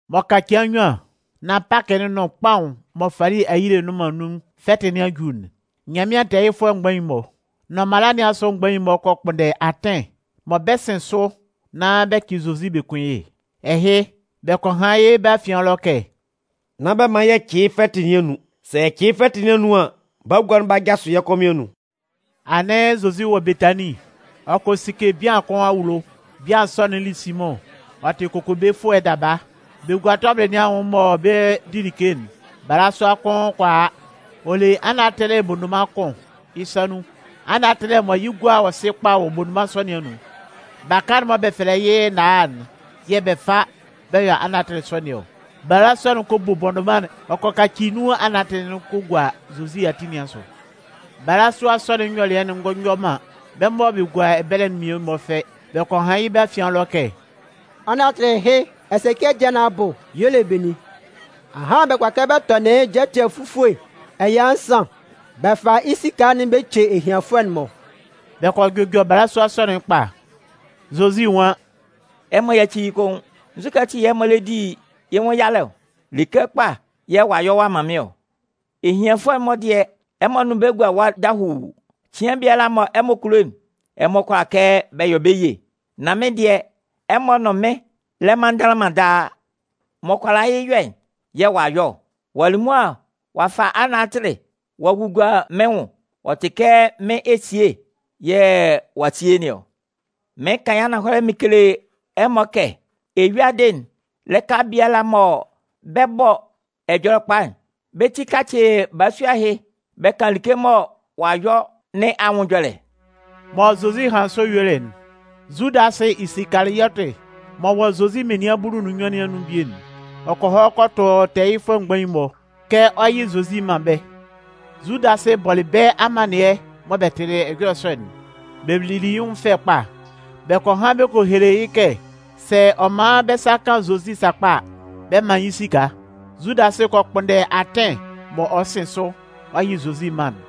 M'ɔ ka cɩan nnyuan nán Pakɩ'n nʋn kpaʋn'n mɔ fali ayile nnʋn man nun'n fɛtɩ nɩn a ju'n, Nyanmɩan tɛɛyɩfʋɛ mgbain'n-mɔ, nʋn mala nɩn asʋ mgbain'n-mɔ kɔ kpʋnndɛ atɩn mɔ bɛ 'sɩn sʋ nán bɛ cɩ Zozi bɛ kun yɩ́. Ɛhɩ, bɛ kɔ han yɩ́ bɛ́ afian ɛlɔ kɛ: “Nán bɛ man yɛ cɩ yɩ́ fɛtɩ nɩn anun. Sɛ yɛ cɩ yɩ́ fɛtɩ nɩn anun an, bagua'n 'ba jasʋ yɛ́ kɔmɩn anun.” Anɩn Zozi wɔ Betanin. Ɔ kɔ sike bian kʋn awulo. Bian sɔ'n li Simʋn, ɔ tɩ kokobefʋɛ daba. Bɛ gua tɔbɩlɩ nɩn anwʋn mɔ bɛ 'di like'n, balasua kʋn kɔ a, ɔ le anatɩlɩ bondoman kʋn yɩ́ sa nun. Anatɩlɩ mɔ yɩ́ gua yɔ sɩ kpa wɔ bondoman sɔ nɩn anun. Baka'n mɔ bɛ fɛlɛ yɩ́ náá'n yɛ̂ bɛ fa bɛ yɔ anatɩlɩ sɔ nɩn ɔ. Balasua'n kɔ bo bondoman'n, ɔ kɔ kaci nun anatɩlɩ'n ɔ kɔ gua Zozi ati nɩn asʋ. Balasua sɔ'n nyɔlɩɛ'n ngɔ yɔ man bɛ́ mɔ bɛ gua ɛbɛlɛ'n mmie-mɔ fɛ. Bɛ kɔ han yɩ́ bɛ́ afian ɛlɔ kɛ: “Anatɩlɩ ɛhɩ ɛsɛcɩɛ dɩɛ nɩn abʋ y'ɔ le benin? Ahan bɛ kʋala kɛ bɛ tɔnɩn yɩ́ jɛtɛ fufue ɛya nsan bɛ fa yɩ́ esika'n bɛ ce ehianfʋɛ'n-mɔ!” Bɛ kɔ jʋjɔ balasua sɔ'n kpa. Zozi nwan: “Ɛmɔ yáci yɩ́ koun. Nzukɛ ati yɛ̂ ɛmɔ lɛ di yɩ́ nwʋn yalɛ ɔ? Like kpa yɛ̂ ɔ'a yɔ ɔ'a man mɩ́n ɔ. Ehianfʋɛ'n-mɔ dɩɛ, ɛmɔ nʋn bɛ́ gua ɛwa dahuu. Cɩan biala mɔ ɛmɔ kulo'n, ɛmɔ kʋala kɛ bɛ yɔ bɛ́ ye. Nan mɩ́n dɩɛ, ɛmɔ nʋn mɩn lɛ man ndanlanman daa. M'ɔ kʋala yɩ́ yɔ'n yɛ̂ ɔ'a yɔ ɔ. Ɔ'a li mʋa ɔ'a fa anatɩlɩ'n ɔ a gugua mɩ́n nwʋn. Ɔ tɩ kɛ mɩ́n esie yɛ̂ ɔ'a sie nɩn ɔ. Mɩɩn kan yɩ́ ananhɔlɛ mɩn kele ɛmɔ kɛ eyuadɩ'n lɩka biala mɔ bɛ 'bɔ Ɛjɔlɛkpa'n, bɛ́ ti 'kacɩ balasua ɛhɩ bɛ kan like mɔ ɔ'a yɔ nɩn anwʋn ɛjɔlɛ.” Mɔ Zozi hanlɩn sɔ yuelɩ'n, Zudasɩ Isikaliɔtɩ m'ɔ wɔ Zozi menian bulu nʋn nnyuan nɩn anun bie'n, ɔ kɔ hɔ kɔ tʋ tɛɛyɩfʋɛ mgbain'n-mɔ, kɛ ɔ 'yɩ Zozi man bɛ́. Zudasɩ bɔlɩ bɛ́ amannɩɛ mɔ bɛ tɩlɩ ɛjɔlɛ sɔ'n, bɛ lili yɩ́ nwʋn fɛ kpa. Bɛ kɔ han bɛ kɔ hele yɩ́ kɛ sɛ ɔ man bɛ́ sa kan Zozi sakpa a, bɛ 'man yɩ́ esika. Zudasɩ kɔ kpʋnndɛ atɩn mɔ ɔ 'sɩn sʋ ɔ yɩ Zozi man'n.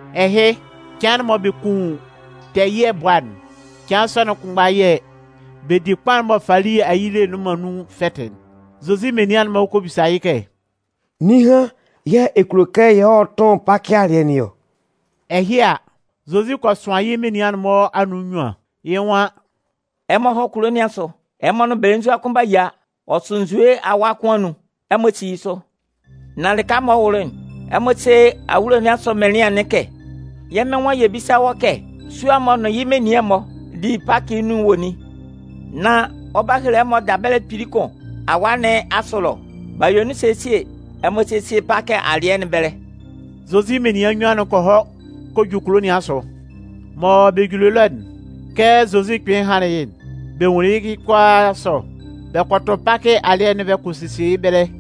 Ɛhɩ, cɩan'n mɔ bɛ kun tɛɛ ɛyɩɛ bʋa'n, cɩan sɔ'n kʋnmgba yɛ̂ bɛ di kpaʋn'n mɔ fali ayile nnʋn man nun'n fɛtɩ'n, Zozi menian'n-mɔ kɔ bisa yɩ́ kɛ: “Ninhan yɛ̂ ɛ kulo kɛ yɛ hɔ́ tʋ́n Pakɩ alɩɛ nɩn ɔ?” Ɛhɩ a, Zozi kɔ sʋan yɩ́ menian'n-mɔ anun nnyuan, yɩ́ nwan: “Ɛmɔ hɔ́ kulo nɩn asʋ, ɛmɔ nʋn belenzua kʋn 'ba yia. Ɔ sʋ nzue awʋa kʋn anun. Ɛmɔ sí yɩ́ sʋ, nán lɩka m'ɔ kɔ wʋlʋ'n, ɛmɔ sé awulo nɩn asʋ mɩnlɩan'n kɛ: ‘Yɛ́ Mɩn nwan yɛ bísa wɔ́ kɛ sua'n m'ɔ nʋn yɩ́ menian'n-mɔ 'di Pakɩ'n nun'n wɔ nin?’ Nán ɔ 'ba hele ɛmɔ dabɛlɛ kpili kʋn awaa nɩn asʋ ɛlɔ. B'a yue nun sesie. Ɛmɔ sésie Pakɩ alɩɛ nɩn ɛbɛlɛ.” Zozi menian nnyuan'n kɔ hɔ kɔ ju kulo nɩn asʋ. Mɔ bɛ juli ɛlɔ'n, kɛ Zozi kpɩnlɩn hanlɩn yɩ'n, bɛ nwunlin yɩ́ kʋalaa sɔ. Bɛ kɔ tʋn Pakɩ alɩɛ'n bɛ kɔ sesie yɩ́ ɛbɛlɛ.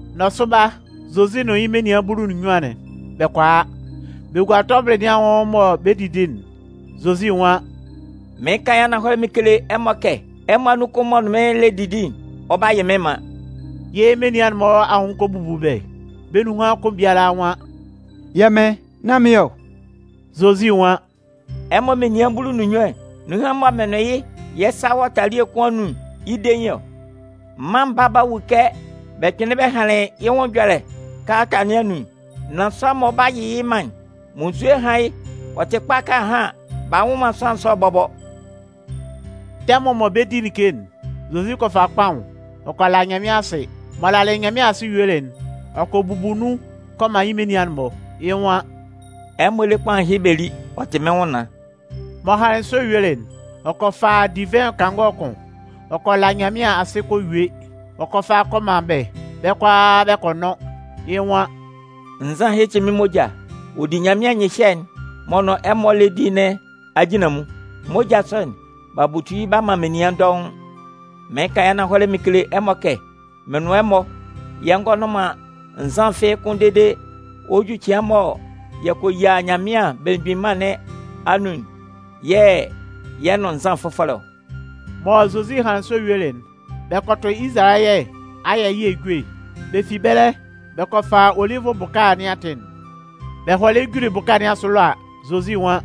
Nɔsʋba, Zozi nʋn yɩ́ menian bulu nʋn nnyuan'n, bɛ kɔ a. Bɛ gua tɔbɩlɩ nɩn anwʋn mɔ bɛ 'didi'n, Zozi nwan: “Mɩɩn kan yɩ́ ananhɔlɛ mɩn kele ɛmɔ kɛ ɛmɔ anun kʋn m'ɔ nʋn mɩ́n lɛ didi'n, ɔ 'ba yɩ́ mɩ́n man.” Yɩ́ menian'n-mɔ anwʋn kɔ bubu bɛ́. Bɛ́ nunhan kʋn biala nwan: “Yɛ́ Mɩn, nán mɩ́n ɔ.” Zozi nwan: “Ɛmɔ menian bulu nʋn nnyuan'n, nunhan mɔ mɩn nʋn yɩ́ yɛ́ sa wɔ talie kʋn anun'n, yɩ́ dein ɔ. Mân Baa'n 'ba wu kɛ bɛ kpɩnlɩn bɛ hanlɩn yɩ́ wɔ Ɛhɛlɛ Ɛjɔlɛ kalata nɩn anun'n. Nan sʋanlan'n mɔ ɔ 'ba yɩ yɩ́ man'n, munnzue hán yɩ́! Ɔ tɩ kpa kɛ ahan b'a nwʋ man sʋanlan sɔ'n bɔbɔ!” Tɛmʋn mɔ bɛ 'di like'n, Zozi kɔ fa kpaʋn, ɔ kɔ la Nyanmɩan asɩ. M'ɔ lalɩ Nyanmɩan asɩ yuelɩ'n, ɔ kɔ bubu nun kɔ man yɩ́ menian'n-mɔ. Yɩ́ nwan: “Ɛmɔ lé kpaʋn ɛhɩ bɛ lí, ɔ tɩ mɩ́n nwʋnnaan.” M'ɔ hanlɩn sɔ yuelɩ'n, ɔ kɔ fa divɩn kangɔ kʋn. Ɔ kɔ la Nyanmɩan asɩ kɔ yue. Ɔ kɔ fa kɔ man bɛ́. Bɛ́ kʋalaa bɛ kɔ nʋn. Yɩ́ nwan: “Nzan ɛhɩ tɩ mɩ́n moja. Ɔ di Nyanmɩan nyɩhyɛ'n m'ɔ nʋn ɛmɔ lɛ di nɩn ajinlanmun. Moja sɔ'n, b'a butu yɩ́ b'a man menian dɔʋn. Mɩɩn kan yɩ́ ananhɔlɛ mɩn kele ɛmɔ kɛ mɩn nʋn ɛmɔ yɛ ngɔ nʋn man nzan fɩ́ɩ́ kʋ́n dede ɔ 'ju cɩan mɔ yɛ kɔ yia Nyanmɩan Belemgbin Mân nɩn anun'n yɛ̂ yɛ 'nʋn nzan fʋfɔlɛ ɔ.” Mɔ Zozi hanlɩn sɔ yuelɩ'n, bɛ kɔ tʋ Izalayɛ ayɛ ɛyɩɛ ejue. Bɛ fi ɛbɛlɛ, bɛ kɔ fa Olivʋ bʋka nɩn atɩn'n. Bɛ hɔlɩ juli bʋka nɩn asʋ ɛlɔ a, Zozi nwan: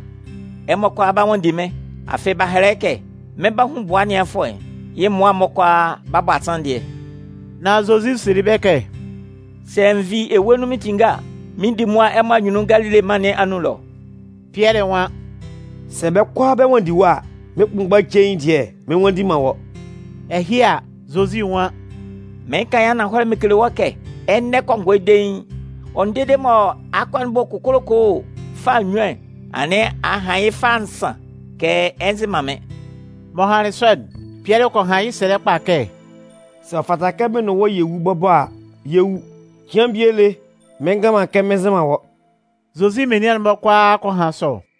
“Ɛmɔ kʋala 'ba nwanndi mɩ́n. Afɩ b'a hɛlɛ yɩ́ kɛ: Mɩn 'ba hun bʋa ɛnɩanfʋɛ'n, yɩ́ mmʋa'n-mɔ kʋalaa 'ba bɔ asanndɩɛ.” Nan Zozi selɩ bɛ́ kɛ: “Sɛ n vi ewue nun mɩn tinnge a, mɩn 'di mʋa ɛmɔ anyunnun Galile mân nɩn anun ɛlɔ.” Pɩɛlɩ nwan: “Sɛ bɛ́ kʋalaa bɛ nwanndi wɔ́ a, mɩ́n kpʋnmgba cein dɩɛ mɩn nnwanndi man wɔ́.” Ɛhɩ a, Zozi nwan: “Mɩɩn kan yɩ́ ananhɔlɛ mɩn kele wɔ́ kɛ, ɛnɛ kɔngɔɛ dein, ɔ nʋn dede mɔ akɔ'n 'bɔ kokolokoo fâ nnyuan'n, anɩn a han yɩ́ fâ nsan kɛ ɛ nzɩ man mɩ́n.” M'ɔ hanlɩn sɔ'n, Pɩɛlɩ kɔ han yɩ́ sɛlɛ kpa kɛ: “Sɛ ɔ fata kɛ mɩn nʋn wɔ́ yɛ wu bɔbɔ a, yɛ 'wu. Cɩan bie lé mɩn ngan man kɛ mɩn nzɩ man wɔ́.” Zozi menian'n-mɔ kʋalaa kɔ han sɔ.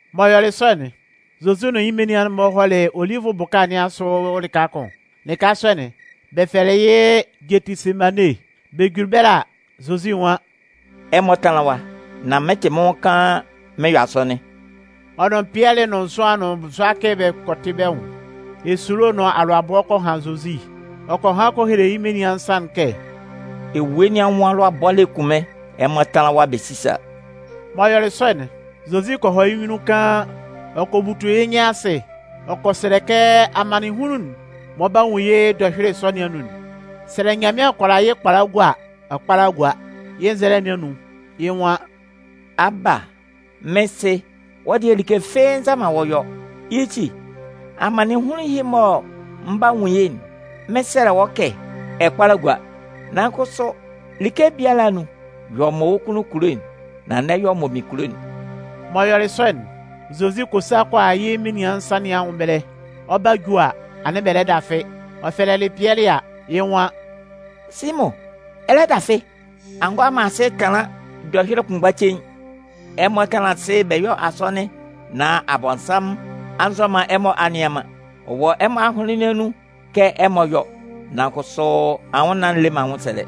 M'ɔ yɔlɩ sɔ'n, Zozi nʋn yɩ́ menian'n-mɔ hɔlɩ Olivʋ bʋka nɩn asʋ lɩka kʋn. Lɩka sɔ'n, bɛ fɛlɛ yɩ́ Gɛtɩsemane. Bɛ juli ɛbɛlɛ a, Zozi nwan: “Ɛmɔ tánlan ɛwa, nan mɩn 'tɩ mɩ́n nwʋn kaan mɩn yɔ asɔnɩn.” Ɔ nʋn Pɩɛlɩ nʋn Zʋan nʋn Zʋakɩ bɛ kɔ tɩ bɛ́ nwʋn. Esulo nʋn alʋabɔ kɔ han Zozi. Ɔ kɔ han kɔ hele yɩ́ menian nsan'n kɛ: “Ewue nɩn anwʋn alʋabɔ lɛ kun mɩ́n. Ɛmɔ tánlan ɛwa, bɛ sísa.” M'ɔ yɔlɩ sɔ'n, Zozi kɔ hɔ yɩ́ nyunnun kaan. Ɔ kɔ butu yɩ́ nyɩn asɩ ɔ kɔ sɛlɛ kɛ amannɩnhunlun'n m'ɔ 'ba nwun yɩ́ dɔhyʋɩlɩ sɔ nɩn anun'n, sɛ Nyanmɩan kʋala yɩ́ kpala gua a, ɔ kpála gúa. Yɩ́ nzɛlɛ nɩn anun, yɩ́ nwan: “Aba, mɩ́n Sɩ, wɔ́ dɩɛ, like fɩ́ɩ́ nza man wɔ́ yɔ. Yɩ́ ti, amannɩnhunlun ɛhɩ mɔ mɩn 'ba nwun yɩ́'n, mɩn 'sɛlɛ wɔ́ kɛ ɛ kpála gúa. Nan kʋsʋ like biala anun, yɔ mɔ wɔ́ kunnun kulo nan n'ɛ yɔ mɔ mɩn kulo'n.” M'ɔ yɔlɩ sɔ'n, Zozi kɔ sa kɔ a yɩ́ menian nsan'n-mɔ anwʋn ɛbɛlɛ. Ɔ 'ba ju a, anɩn bɛ lɛ dafɩ. Ɔ fɛlɛlɩ Pɩɛlɩ a, yɩ́ nwan: “Simʋn, ɛ lɛ dafɩ? A ngʋala man asɩ tanlan dɔhyʋɩlɩ kʋnmgba cein? Ɛmɔ tánlan asɩ bɛ yɔ́ asɔnɩn nán Abɔnsanmʋn a nzɔ man ɛmɔ a nnɩan man. Ɔ wɔ ɛmɔ ahʋnlɩn nɩn anun kɛ ɛmɔ 'yɔ, nan kʋsʋ anwʋnnaan'n le man anwʋnsɛlɛ.”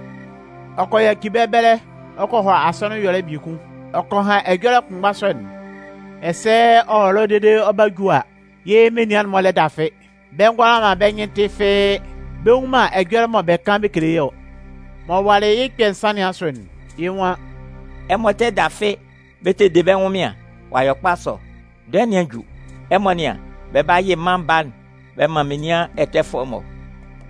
Ɔ kɔ yaci bɛ́ ɛbɛlɛ ɔ kɔ hɔ asɔnɩn ɛyɔlɛ biekun. Ɔ kɔ han ɛjɔlɛ kʋnmgba sɔ'n. Ɛsɛ ɔ wɔ ɛlɔ dede ɔ 'ba ju a, yɩ́ menian'n-mɔ lɛ dafɩ. Bɛ ngʋala man bɛ́ nyɩn tɩ fɩ́ɩ́. Bɛ nnwun man ɛjɔlɛ mɔ bɛ kan bɛ kele yɩ́ ɔ. M'ɔ walɩ yɩ́ kpɛ̂ nsan nɩn asʋ'n, yɩ́ nwan: “Ɛmɔ tɛ dafɩ bɛ tɛ de bɛ́ ɛnwʋnmɩan? Ɔ'a yɔ kpa sɔ! Dɔɛ nɩn a ju. Ɛmɔ nɩ́an, bɛ 'ba yɩ Mân Baa'n bɛ man menian ɛtɛfʋɛ'n-mɔ.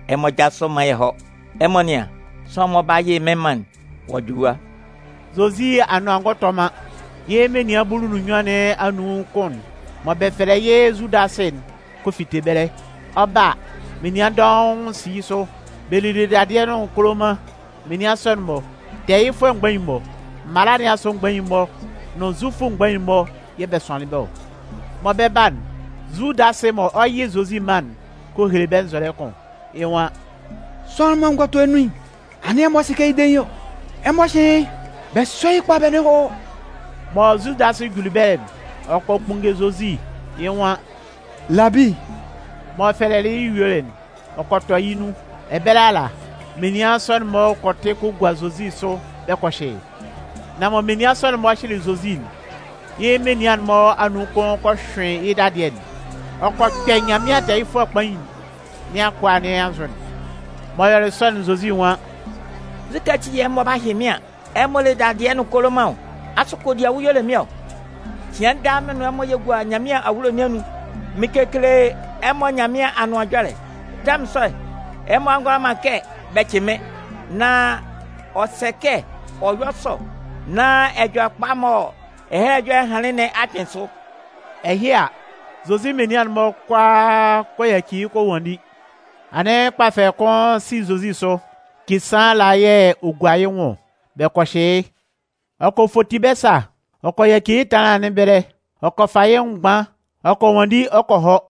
Ɛmɔ jásʋ bɛ mán yɛ hɔ́! Ɛmɔ nɩ́an, sʋanlan'n mɔ ɔ 'ba yɩ mɩ́n man'n, ɔ'a ju ɛwa.” Zozi anʋan ngɔ tɔ man, yɩ́ menian bulu nʋn nnyuan nɩn anun kʋn'n mɔ bɛ fɛlɛ yɩ́ Zudasɩ'n kɔ fite ɛbɛlɛ. Ɔ 'ba a, menian dɔʋn si yɩ́ sʋ. Bɛ lile dadɩɛ nʋn koloman. Menian sɔ'n-mɔ, tɛɛyɩfʋɛ mgbain'n-mɔ, mala nɩn asʋ mgbain'n-mɔ nʋn Zufʋ mgbain'n-mɔ yɛ̂ bɛ sʋanlɩn bɛ́ ɔ. Mɔ bɛ 'ba'n, Zudasɩ mɔ ɔ 'yɩ Zozi man'n kɔ hele bɛ́ nzɔlɛ kʋn. Yɩ́ nwan: “Sʋanlan'n mɔ n gɔ tɔ yɩ́ nun'n, anɩn ɛmɔ sɩ kɛ yɩ́ dein yɩ́ ɔ. Ɛmɔ hyɩ́ yɩ́. Bɛ sɔ́ yɩ́ kpa bɛ nʋn yɩ́ hɔ́.” Mɔ Zudasɩ juli ɛbɛlɛ'n, ɔ kɔ kpunnge Zozi, yɩ́ nwan: “Labi!” M'ɔ fɛlɛlɩ yɩ́ yuelɩ'n, ɔ kɔ tɔ yɩ́ nun. Ɛbɛlɛ ala, menian sɔ'n-mɔ kɔ tɩ kɔ gua Zozi sʋ bɛ kɔ hyɩ yɩ́. Nan mɔ menian sɔ'n-mɔ hyɩlɩ Zozi'n, yɩ́ menian'n-mɔ anun kʋn kɔ hyʋɩn yɩ́ dadɩɛ'n. Ɔ kɔ kpɛ Nyanmɩan tɛɛyɩfʋɛ kpain nɩn akʋa nɩn anzʋ'n. M'ɔ yɔlɩ sɔ'n Zozi nwan: “Nzukɛ ati yɛ̂ ɛmɔ 'ba hyɩ mɩ́n an, ɛmɔ le dadɩɛ nʋn koloman ɔ? Asʋ kodiawu y'ɔ le mɩ́n ɔ? Cɩan daa mɩ́n nʋn ɛmɔ yɛ gua Nyanmɩan awulo nɩn anun, mɩn kekele ɛmɔ Nyanmɩan Anʋan Ɛjɔlɛ. Tɛmʋn sɔ'n, ɛmɔ ngʋala man kɛ bɛ cɩ mɩ́n. Nan ɔ sɛ kɛ ɔ yɔ́ sɔ nán ɛjɔlɛ'n mɔ Ɛhɛlɛ Ɛjɔlɛ'n hanlɩn nɩn a kpɩn sʋ.” Ɛhɩ a, Zozi menian'n-mɔ kʋalaa kɔ yaci yɩ́ kɔ nwanndi. Anɩn kpafɛlɛ kʋn si Zozi sʋ, kisaan ala yɛ̂ ɔ gua yɩ́ nwʋn ɔ. Bɛ kɔ hyɩ yɩ́, ɔ kɔ foti bɛ́ sa, ɔ kɔ yaci yɩ́ ɛtanlan nɩn ɛbɛlɛ. Ɔ kɔ fa yɩ́ nwʋn mgban ɔ kɔ nwanndi ɔ kɔ hɔ.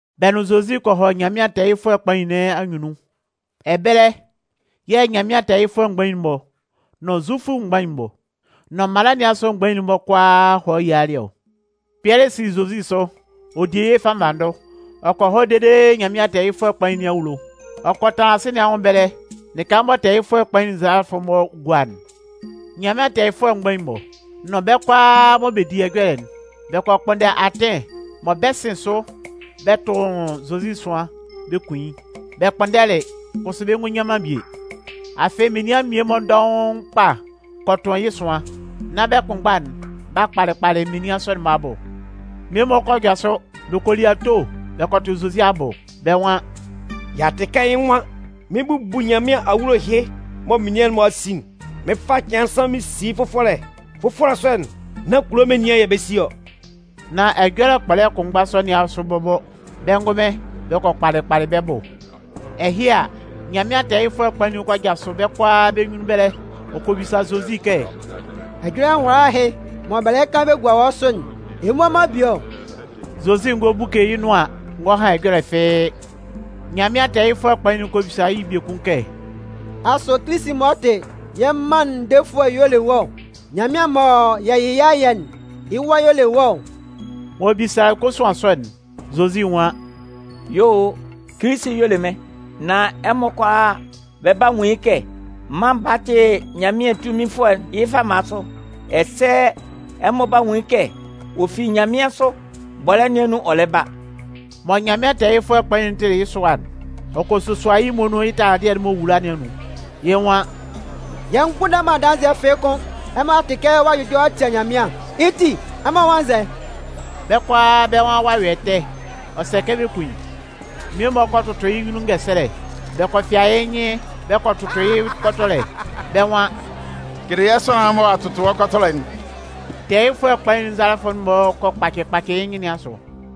Bɛ nʋn Zozi kɔ hɔ Nyanmɩan tɛɛyɩfʋɛ kpain nɩn anyunnun. Ɛbɛlɛ yɛ̂ Nyanmɩan tɛɛyɩfʋɛ mgbain'n-mɔ nʋn Zufʋ mgbain'n-mɔ, nʋn mala nɩn asʋ mgbain'n-mɔ kʋalaa hɔlɩ yialɩ ɔ. Pɩɛlɩ si Zozi sʋ, ɔ di yɩ́ fannvanndʋ. ɔ kɔ hɔ dede Nyanmɩan tɛɛyɩfʋɛ kpain nɩn awulo. Ɔ kɔ tanlan sɩ̂n nɩn anwʋn ɛbɛlɛ lɩka mɔ tɛɛyɩfʋɛ kpain'n nzalafʋ'n-mɔ gua'n. Nyanmɩan tɛɛyɩfʋɛ mgbain'n-mɔ, nʋn bɛ́ kʋalaa mɔ bɛ di ɛjɔlɛ'n, bɛ kɔ kpʋnndɛ atɩn mɔ bɛ 'sɩn sʋ bɛ tʋn Zozi ɛsʋan, bɛ kun yɩ́. Bɛ kpʋnndɛlɩ, kʋsʋ bɛ ngɔ nyan man bie. Afɩ menian mmie-mɔ dɔʋn kpa kɔ tʋn yɩ́ ɛsʋan, nan bɛ́ kʋnmgba'n b'a kpalɩ kpalɩ menian sɔ'n-mɔ abʋ. Mmie-mɔ kɔ jasʋ, bɛ kɔ li ato bɛ kɔ tʋ Zozi abʋ. Bɛ́ nwan: “Y'a tɩ kɛ yɩ́ nwan: ‘Mɩn 'bubu Nyanmɩan awulo ɛhɩ mɔ menian'n-mɔ a si'n. Mɩn 'fa cɩan nsan mɩn si yɩ́ fʋfɔlɛ. Fʋfɔlɛ sɔ'n, nan kulo menian yɛ̂ bɛ 'si ɔ.’” Nan ɛjɔlɛ kpɔlɛ kʋnmgba sɔ nɩn asʋ bɔbɔ, bɛ́ ngʋnmɩn, bɛ kɔ kpalɩ kpalɩ bɛ́ bʋ. Ɛhɩ a, Nyanmɩan tɛɛyɩfʋɛ kpain'n kɔ jasʋ bɛ́ kʋalaa bɛ́ nyunnun ɛbɛlɛ, ɔ kɔ bisa Zozi kɛ: “Ɛjɔlɛ nwala ɛhɩ mɔ bɛ lɛ kan bɛ gua wɔ́ sʋ'n, ɛ mmua man bie ɔ?” Zozi ngɔ buke yɩ́ nʋan ngɔ han ɛjɔlɛ fɩ́ɩ́. Nyanmɩan tɛɛyɩfʋɛ kpain'n kɔ bisa yɩ́ biekun kɛ: “Asʋ Kilisi'n m'ɔ tɩ yɛ́ mân'n defʋɛ'n y'ɔ le wɔ́ ɔ? Nyanmɩan mɔ yɛ yɩ yɩ́ ayɛ'n, yɩ́ Wa y'ɔ le wɔ́ ɔ?” M'ɔ bisalɩ kosuan sɔ'n, Zozi nwan: “Yuo o, Kilisi'n y'ɔ le mɩ́n. Nan ɛmɔ kʋalaa bɛ 'ba nwun yɩ́ kɛ Mân Baa'n tɩ Nyanmɩan tunminfʋɛ'n yɩ́ fama sʋ. Ɛsɛ ɛmɔ 'ba nwun yɩ́ kɛ ɔ fi nyanmɩansʋ bɔlɛ́ nɩn anun ɔ lɛ ba.” Mɔ Nyanmɩan tɛɛyɩfʋɛ kpain'n tɩlɩ yɩ́ sʋa'n, ɔ kɔ sosua yɩ́ muonun yɩ́ taladɩɛ'n m'ɔ wula nɩn anun. Yɩ́ nwan: “Yɛ mgbʋnndɛ man adanzɩɛ fɩ́ɩ́ kʋ́n. Ɛmɔ a tɩ kɛ ɔ'a jʋjɔ ɔ'a tia Nyanmɩan, yɩ́ ti, ɛmɔ nwan nzɛ?” Bɛ́ kʋalaa bɛ́ nwan ɔ'a yɔ ɛtɛ, ɔ sɛ kɛ bɛ kun yɩ́. Mmie-mɔ kɔ tʋtʋ yɩ́ nyunnun ngɛsɛlɛ. Bɛ kɔ fɩa yɩ́ nyɩn bɛ kɔ tʋtʋ yɩ́ kɔtɔlɛ. Bɛ́ nwan: “Kele yɛ́ sʋanlan'n mɔ ɔ'a tʋtʋ wɔ́ kɔtɔlɛ'n!” Tɛɛyɩfʋɛ kpain'n nzalafʋ'n-mɔ kɔ kpacɩ kpacɩ yɩ́ nyɩn nɩn asʋ.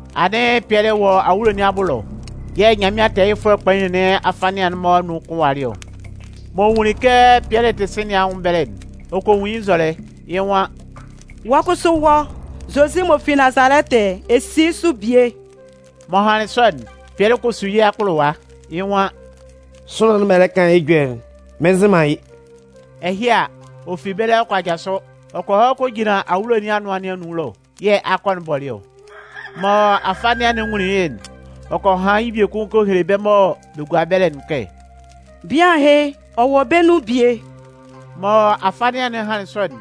Anɩn Pɩɛlɩ tɛ wɔ awulo nɩn abʋ ɛlɔ yɛ̂ Nyanmɩan tɛɛyɩfʋɛ kpain nɩn afanɩan'n-mɔ anun kʋn walɩ ɔ. M'ɔ nwunlin kɛ Pɩɛlɩ tɩ sɩ̂n nɩn anwʋn ɛbɛlɛ'n, ɔ kɔ nwun yɩ́ nzɔlɛ. Yɩ́ nwan: “Wɔ́ kʋsʋ wɔ́, Zozi m'ɔ fi Nazalɛtɩ'n, ɛ si yɩ́ sʋ bie.” M'ɔ hanlɩn sɔ'n, Pɩɛlɩ kɔ su yɩ́ akpʋlʋwa. Yɩ́ nwan: “Sʋanlan'n mɔ ɛ lɛ kan yɩ́ ɛjɔlɛ'n, mɩn nzɩ man yɩ́.” Ɛhɩ a, ɔ fi ɛbɛlɛ ɔ kɔ jasʋ, ɔ kɔ hɔ kɔ jinlan awulo nɩn anʋan nɩn anun ɛlɔ [yɛ̂ akɔ'n bɔlɩ ɔ.] Mɔ afanɩan'n nwunlin yɩ́'n, ɔ kɔ han yɩ́ biekun kɔ hele bɛ́ mɔ bɛ gua ɛbɛlɛ'n kɛ: “Bian ɛhɩ, ɔ wɔ bɛ́ nun bie!” Mɔ afanɩan'n hanlɩn sɔ'n,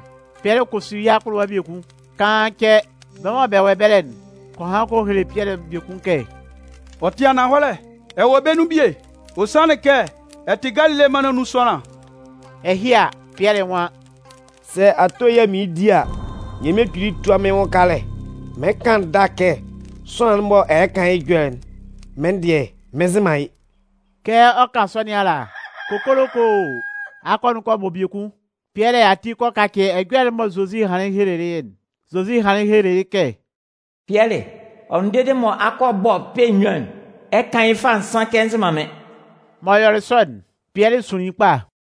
Pɩɛlɩ kɔ su yɩ́ akpʋlʋwa biekun. Kaan cɛ, bɛ́ mɔ bɛ wɔ ɛbɛlɛ'n kɔ han kɔ hele Pɩɛlɩ biekun kɛ: “Ɔ tɩ ananhɔlɛ, ɛ wɔ bɛ́ nun bie. Ɔ sanlɩn kɛ ɛ tɩ Galile mân nɩn anun sʋanlan.” Ɛhɩ a, Pɩɛlɩ nwan: “Sɛ ato yɛ̂ mɩɩn di a, Nyanmɩan Kpili túa mɩ́n yɩ́ nwʋn kalɛ. Mɩn kan ndâ kɛ sʋanlan'n mɔ ɛmɔ lɛ kan yɩ́ ɛjɔlɛ'n, mɩ́n dɩɛ mɩn nzɩ man yɩ́.” Kɛ ɔ 'kan sɔ nɩn ala, kokolokoo! Akɔ'n kɔ bɔ biekun. Pɩɛlɩ ati kɔ kacɩ ɛjɔlɛ'n mɔ Zozi hanlɩn helelɩ yɩ́'n. Zozi hanlɩn helelɩ yɩ́ kɛ: “Pɩɛlɩ, ɔ nʋn dede mɔ akɔ'n 'bɔ kpɛ̂ nnyuan'n, ɛ 'kan yɩ́ fâ nsan kɛ ɛ nzɩ man mɩ́n.” M'ɔ yɔlɩ sɔ'n, Pɩɛlɩ sunlin kpa.